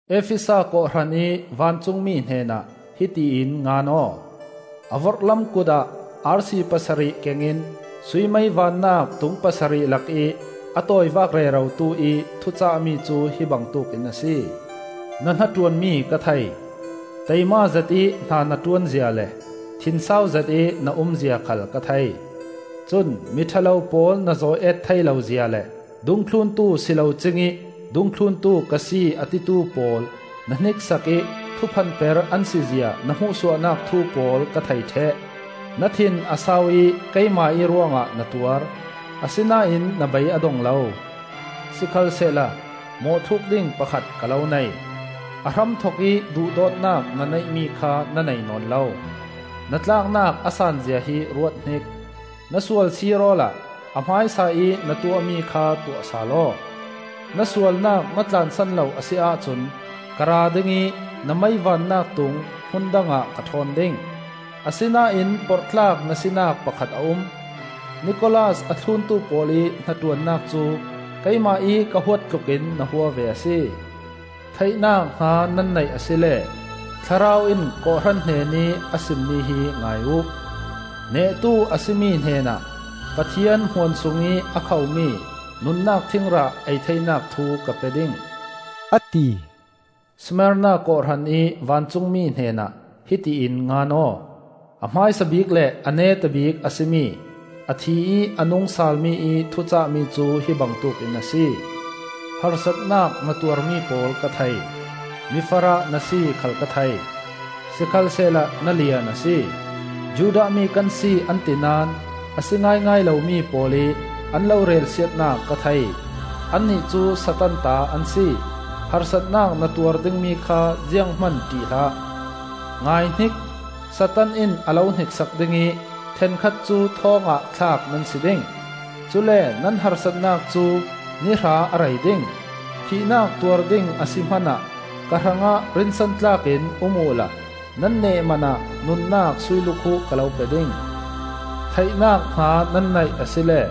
“Efesa kawhhran ih vancungmi hnenah hiti in ngan aw: A vorhlam kutah arsi pasarih kengin sui mei vannak tung pasarih lakih a tawivak rerotu ih thucahmi cu hi bangtuk in a si: Na hnaṭuanmi ka thei; taima zetih hna na ṭuan zia le thinsau zetih na um zia khal ka thei. Cun miṭha lo pawl na zawi-eet thei lo zia le dungthluntu si lo cingih dungthluntu ka si a titu pawl na hniksak ih thuphanper an si zia na hmuhsuahnak thu pawl ka thei ṭheh. Na thin a sau ih keimah ih ruangah na tuar; asinain na bei a dong lo. Sikhalsehla mawhthluk ding pakhat ka lo nei: a hramthokih duhdawtnak na neihmi kha na nei nawn lo. Na tlaknak a san zia hi ruathnik. Na sual sir awla a hmaisaih na tuahmi kha tuah sal aw. Na sualnak na tlansan lo a si ahcun ka ra ding ih na mei vannak tung hmun dangah ka ṭhawn ding. Asinain porhtlak na sinak pakhat a um. Nikolas a thluntu pawl ih hnaṭuannak cu keimah ih ka huat tlukin na hua ve a si. “Theihnak hna nan neih asile Thlarau in kawhhran hnenih a simmi hi ngai uh. “Nehtu a si mi hnenah Pathian Hmuan sungih a khomi nunnak thingrah ei theinak thu ka pe ding,” a ti. “Smarna kawhhran ih vancungmi hnenah hiti in ngan aw: a hmaisa bik le a neta bik a si mi, a thi ih a nung salmi ih thucahmi cu hi bangtuk in a si. Harsatnak na tuarmi pawl ka thei. Mifarah na si khal ka thei: sikhalsehla na lian a si. Judah mi kan si an ti naón a si ngaingai lomi pawl ih an lo relsiatnak ka thei. Annih cu Satan ta an si. Harsatnak na tuar dingmi kha zianghman ṭih hlah. Ngaihnik! Satan in a lo hniksak ding ih ṭhenkhat cu thawngah thlak nan si ding. Cule nan harsatnak cu nihra a rei ding. Thihnak tuar ding a si hmanah ka hrangah rinsan tlak in um uhla nan neh man ah nunnak suilukhuh ka lo pe ding. “Theihnak hna nan neih asile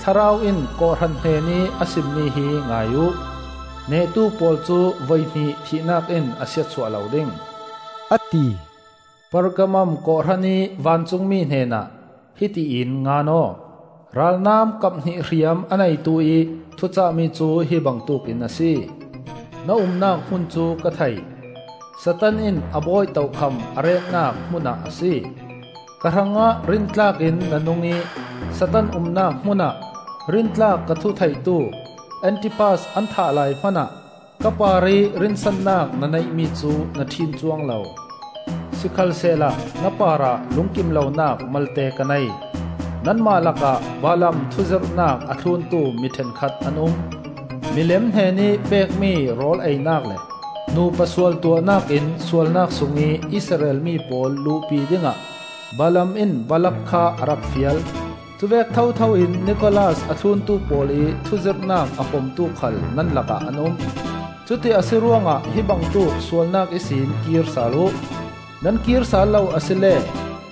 Thlarau in kawhhran hnenih a simmi hi ngai uh. “Nehtu pawl cu voihnih thihnak in a siatsuah lo ding,” a ti. “Pergamum kawhhran ih vancungmi hnenah hiti in ngan aw: ralnam kaphnih hriam a neituih thucahmi cu hi bangtuk in a si. Na umnak hmun cu ka thei: Satan in a bawi tokham a retnak hmunah a si. Ka hrangah rintlak in na nung ih Satan umnak hmunah rintlak ka thu theitu Antipas an thah lai hmanah ka parih rinsannak na neihmi cu na ṭhin cuang lo. Sikhalsehla na parah lungkim lonak malte ka nei: nanmah lakah Balaam thuzirhnak a thluntu mi ṭhenkhat an um. Milem hnenih pekmi rawl einak le nupa sualtuahnak in sualnak sungih Israel mi pawl luhpi dingah Balaam in Balak kha a rak fial. Cuvek thothoin Nikolas a thluntu pawl ih thuzirhnak a pomtu khal nan lakah an um. Cuti a si ruangah hi bangtuk sualnak ihsin kir sal uh. Nan kir sal lo asile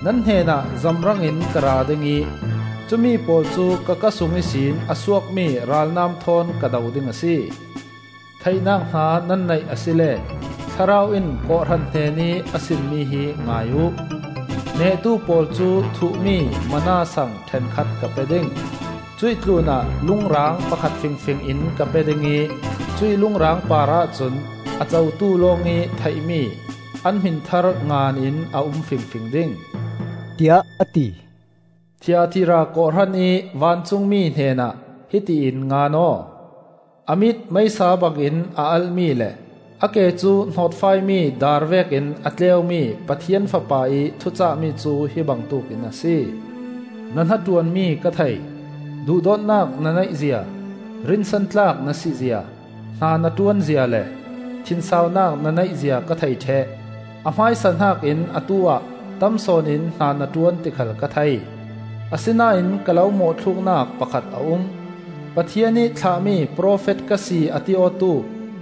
nan hnenah zamrangin ka ra ding ih cumi pawl cu ka kaa sung ihsin a suakmi ralnam thawn ka do ding a si. “Theihnak hna nan neih asile Thlarau in kawhhran hnenih a sim mi hi ngai uh. “Nehtu pawl cu thuh-mi Manna sang ṭhenkhat ka pe ding. Cuih tlunah lung raang pakhat fingfing in ka pe ding ih cuih lung raang parah cun a cotu lawngih theihmi an hmin thar ngan in a um fingfing ding,” tiah a ti. “Thiatira kawhhran ih vancungmi hnenah hiti in ngan aw: a mit meisa bangin a alh-mi le a ke cu hnawtfaimi daar vekin a tleumi Pathian Fapa ih thucahmi cu hi bangtuk in a si. Na hnaṭuanmi ka thei. Duhdawtnak na neih zia, rinsantlak na si zia, hna na ṭuan zia le thinsaunak na neih zia ka thei ṭheh. A hmaisa hnakin atu-ah tam sawn in hna na ṭuan ti khal ka thei. Asinain ka lo mawhthluknak pakhat a um: Pathian ih thlahmi profet ka si a ti awtu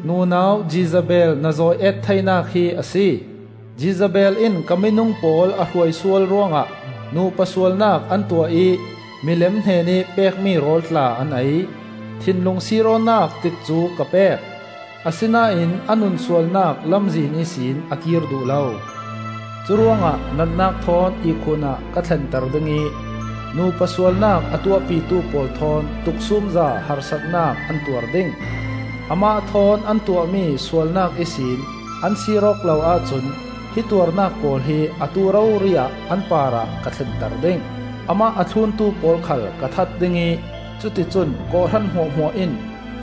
nunau Jezebel na zawi-eet theinak hi a si. Jezebel in ka minung pawl a hruaisual ruangah nupa sualnak an tuah ih milem hnenih pekmi rawl tla an ei. Thinlung sir awknak tikcu ka pek, asinain a nunsualnak lamzin ihsin a kir duh lo. Curuangah natnak thawn ihkhun ah ka thlenter ding ih nupa sualnak a tuahpitu pawl thawn tuksumza harsatnak an tuar ding. Amah thawn an tuahmi sualnak ihsin an sir awk lo ahcun hi tuarnak pawl hi atu rori-ah an parah ka thlenter ding. Amah a thluntu pawl khal ka that ding ih cuticun kawhhran hmuahhmuah in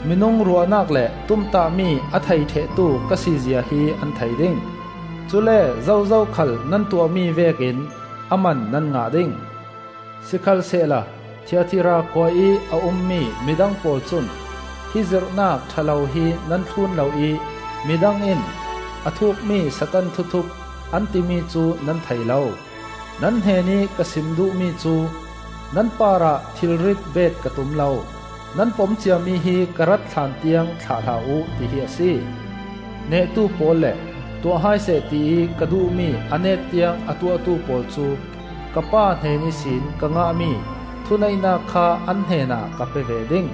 minung ruahnak le tumtahmi a thei ṭhehtu ka si zia hi an thei ding. Cule zozo khal nan tuahmi vekin a man nan ngah ding. “Sikhalsehla Thiatira khua ih a ummi midang pawl cun hi zirhnak ṭha lo hi nan thlun lo ih midang in, ‘A thukmi Satan thuthup,’ an timi cu nan thei lo. Nan hnenih ka sim duhmi cu: nan parah thilrit bet ka tum lo; nan pom ciami hi ka rat hlan tiang thlah hlah uh, tihi a si. Nehtu pawl le tuah hai seh tiih ka duhmi a net tiang a tuahtu pawl cu ka Pa hnen ihsin ka ngahmi thuneihnak kha an hnenah ka pe ve ding.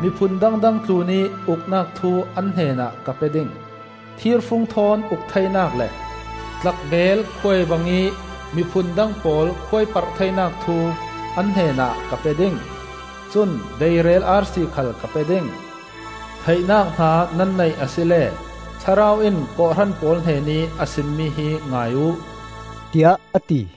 Miphun dangdang tlunih uknak thu an hnenah ka pe ding; thirfung thawn uk theinak le tlak beel khuai bangih miphun dang pawl khuaiparh theinak thu an hnenah ka pe ding. Cun deirel arsi khal ka pe ding. “Theihnak hna nan neih asile Thlarau in kawhhran pawl hnenih a sim mi hi ngai uh,” tiah a ti.